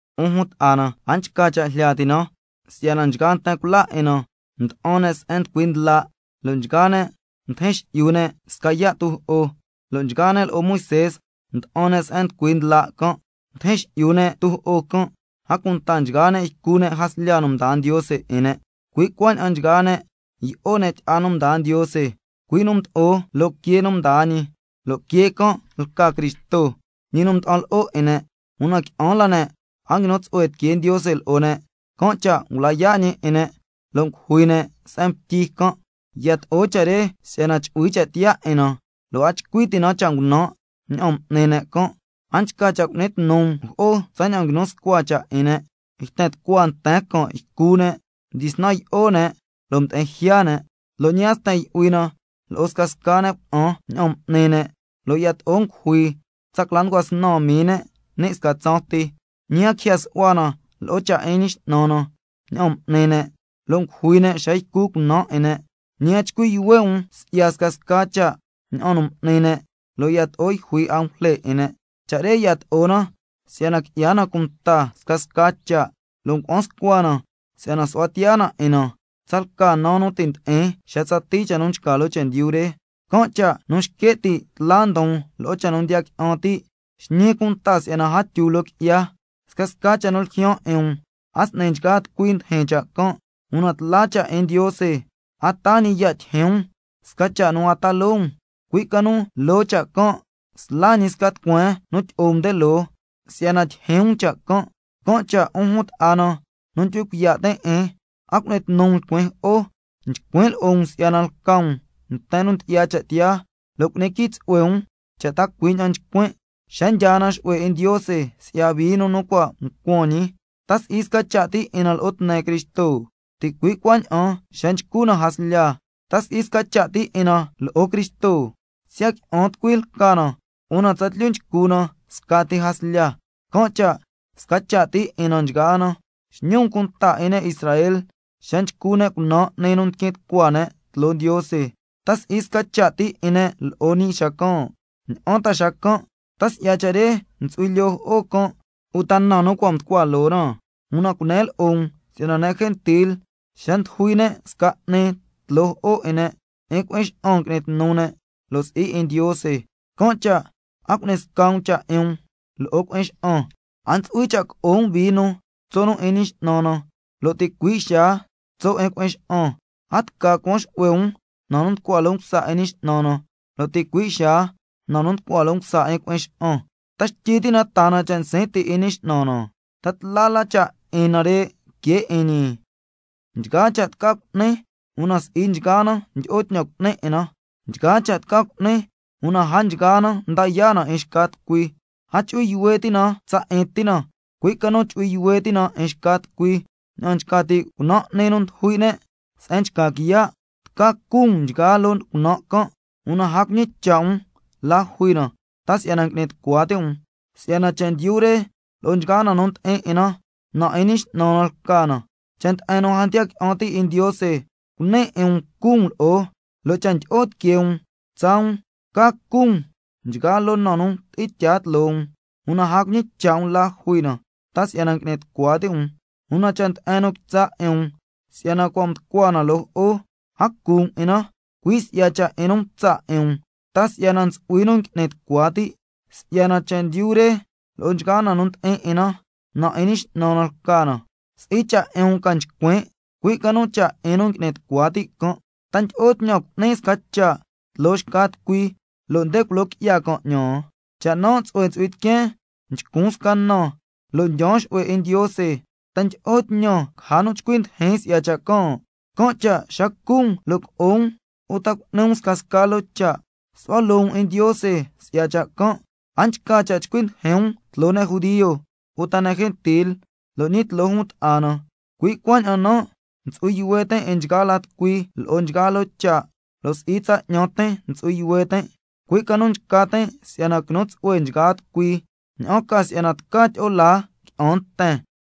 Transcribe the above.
'Un jun ta'a na, a nchca cha' jlya ti' na si'yana nchgaa nten cula 'in na mda'an ne' se'en nducui ndla', lo' nchgaa ne' mdijin xi'yu ne' sca yaa' tujo'o, lo' nchgaa ne' lo'o Moisé mda'an ne' se'en nducui ndla' can', mdijin xi'yu ne' tujo'o can', a cunta nchgaa ne' ycu ne' jaslya nu mdaa Ndiose 'in ne', cui' cuaña'an nchgaa ne' yi'o ne' tyi'a nu mdaa Ndiose, cui' nu mdo'o loo quee nu mdaa ñi, lo' quee can' lca Cristo, ñi nu mda'an lo'o 'in ne'. Una qui'an la ne' a nguinu tsu'hue tiquee Ndiose lo'o ne', can' cha' ngula yaa' ñi 'in ne' si'yana caja ne' se'en ngutyi can'. Yato'o cha' re si'yana chu'hui cha' tiyaa 'in na, lo' a chcui ti' na cha' ngunan' ña'an m'ni ne' can'. A nchca cha' cu'ni tnu um jo'o tsaña'an nguinu scua cha' 'in ne': —Yten tucua nten can' ycu ne', mdyisnan yi'o ne', lo' mdi'in jya ne'—. Lo' ñi a ntsu'hui cha' sten yu'hui na lo'o scasca ne' cuna'an ña'an m'ni ne', lo' yato'o ngujui tsa cla nducua snan mii ne', ni' sca tsaan ti. Ñi a quijya su'hua na lo'o cha' 'in Ñi X'nan na ña'an m'ni ne', yato'o ngujui ne' xa ycu cunaan 'in ne'. Ñi a chcui' yuhue' um si'ya scasca cha', ña'an nu m'ni ne', lo' yato'o yjui angujle 'in ne'. Cha' re yato'o na si'yana qui'ya na cunta scasca cha', lo' ngua'an scua na si'yana su'hua tiyaa na 'in na, tsalca nu ti' ndi'in xa tsatii cha' nu nchca loo chendyu re. Can' cha' nu xque' ti' tla ndon lo'o cha' nu ndiya qui'an ti', xñi cunta si'yana a tyu loo qui'ya. Scasca cha' nu ljyaan 'in um, a s'ni nchgaa tucui ndijin cha' can', una tla cha' 'in Ndiose, a taa ñi ya' tyijyin um sca cha' nu a ta loo um, cui' ca nu loo cha' can' sla ñi sca tucueen nu tyi'o um nde loo, si'yana tyijyin um cha' can'. Can' cha' 'un jun ta'a na nu ndyu'hui cuiya' tin' 'in, a cu'ni tnu um lcuin jo'o. Nchcuin' lo'o um si'yana lca um nten nu ndyi'ya cha' tiyaa, lo' cu'ni quii tsu'hue um cha' ta cui' ña'an nchcuin'. Xa ndyaa na xu'hue 'in Ndiose si'ya vino nu cua' ncuan ñi, ¿ta si'i sca cha' ti 'in na si'ya tne Cristo? Ticui' cuaña'an xa nchcu na jaslya, ¿ta si'i sca cha' ti 'in na lo'o Cristo? Siya' qui'an tucui lca na una tsatlyu nchcu na scati jaslya, can' cha' sca cha' ti 'in na nchgaa na. Xñi um cunta 'in ne' Israel xa nchcu ne' cunan' 'ni nu ndiquin tucua ne' tloo Ndiose, ¿ta si'i sca cha' ti 'in ne' lo'o ñi xacan'? ¿Ña'an ta xacan'? ¿Ta si'ya cha' re ntsu'hui lyoo jo'o can' uta na nu cua' mducua loo na? Una cunen lo'o um si'yana ne' gentil xa ndujui ne' sca 'ni tloo jo'o 'in ne', 'in cui'in xa'an ngui'ni tnu ne', lo' si'i 'in Ndiose, can' cha' a cu'ni sca um cha' 'in um lo'o cui'in xa'an. A ntsu'hui cha' co'o um vino tso' nu 'in Ñi X'nan na, lo' ticui' xaa tso' 'in cui'in xa'an, a tca cuan xu'hue um na nu nducua loo msa 'in Ñi X'nan na, lo' ticui' xaa na nu nducua loo msa 'in cui'in xa'an. ¿Ta xtyi ti' na taa na cha' nsin' ti' 'in Ñi X'nan na? ¿Ta tla la cha' 'in nare' que 'in ñi? Nchgaa cha' tca cu'nin, una si'i nchgaa na ndyi'o tñan cu'nin 'in na, nchgaa cha' tca cu'nin, una a nchgaa na nda yaa' na 'in xca tucui. A chu'hui yuhue ti' na tsa 'in ti na, cui' ca nu chu'hui yuhue ti' na 'in xca tucui. Ña'an nchca ti' cunan' 'ni nu ndujui' ne' se'en nchca quiya', tca cu um nchgaa loo cunan' can', una a cuñicha' um la jui na, ta si'yana ngui'ni tucua ti' um, —si'yana chendyu re lo'o nchgaa na nu ndi'in 'in na, na 'in Ñi X'nan na lca na—. Cha' nde'en nu a ndiya qui'an ti' 'in Ndiose cuni 'in um cu um lo'o, lo' cha' ndyi'o tiquee um tsaa um, tca cu um nchgaa loo na nu tyi'in tyaa tloo um, una a cuñicha' um la jui na, ta si'yana ngui'ni tucua ti' um. Una cha' nde'en nu quitsa' 'in um si'yana cua' mducua na loo jo'o, a cu um 'in na, cui' si'ya cha' 'in nu mtsa' 'in um ta si'yana ntsu'hui nu ngui'ni tucua ti', —si'yana chendyu re lo'o nchgaa na nu ndi'in 'in na, na 'in Ñi X'nan na lca na—. Si'i cha' 'in um ca nchcuin', cui' ca nu cha' 'in nu ngui'ni tucua ti' can'. ¿Ta ndyi'o tñan cu'nin sca cha' tloo xca tucui si'yana culo qui'ya can' 'ñan? Cha' nan' tsu'hue ntsu'hui tiqueen nchcun sca na lo' ndyaan xu'hue 'in Ndiose, ¿ta ndyi'o tñan caja nu chcui ndijin si'ya cha' can'? Can' cha' xa cu um lo' co'o um, uta cu'ni um scasca loo cha', su'hua loo um 'in Ndiose si'ya cha' can'. A nchca cha' chcui ndijin um tloo ne' judio, uta ne' gentil, lo' ñi tloo jun ta'a na. Cui' cuaña'an nan' ntsu'hui yuhue tin' 'in nchgaa la tucui lo'o nchgaa loo cha', lo' si'i tsa 'ñan tin ntsu'hui yuhue tin', cui' ca nu nchca tin' si'yana quinu tsu'hue nchgaa tucui, ña'an ca si'yana tca tyi'o laa qui'an nten.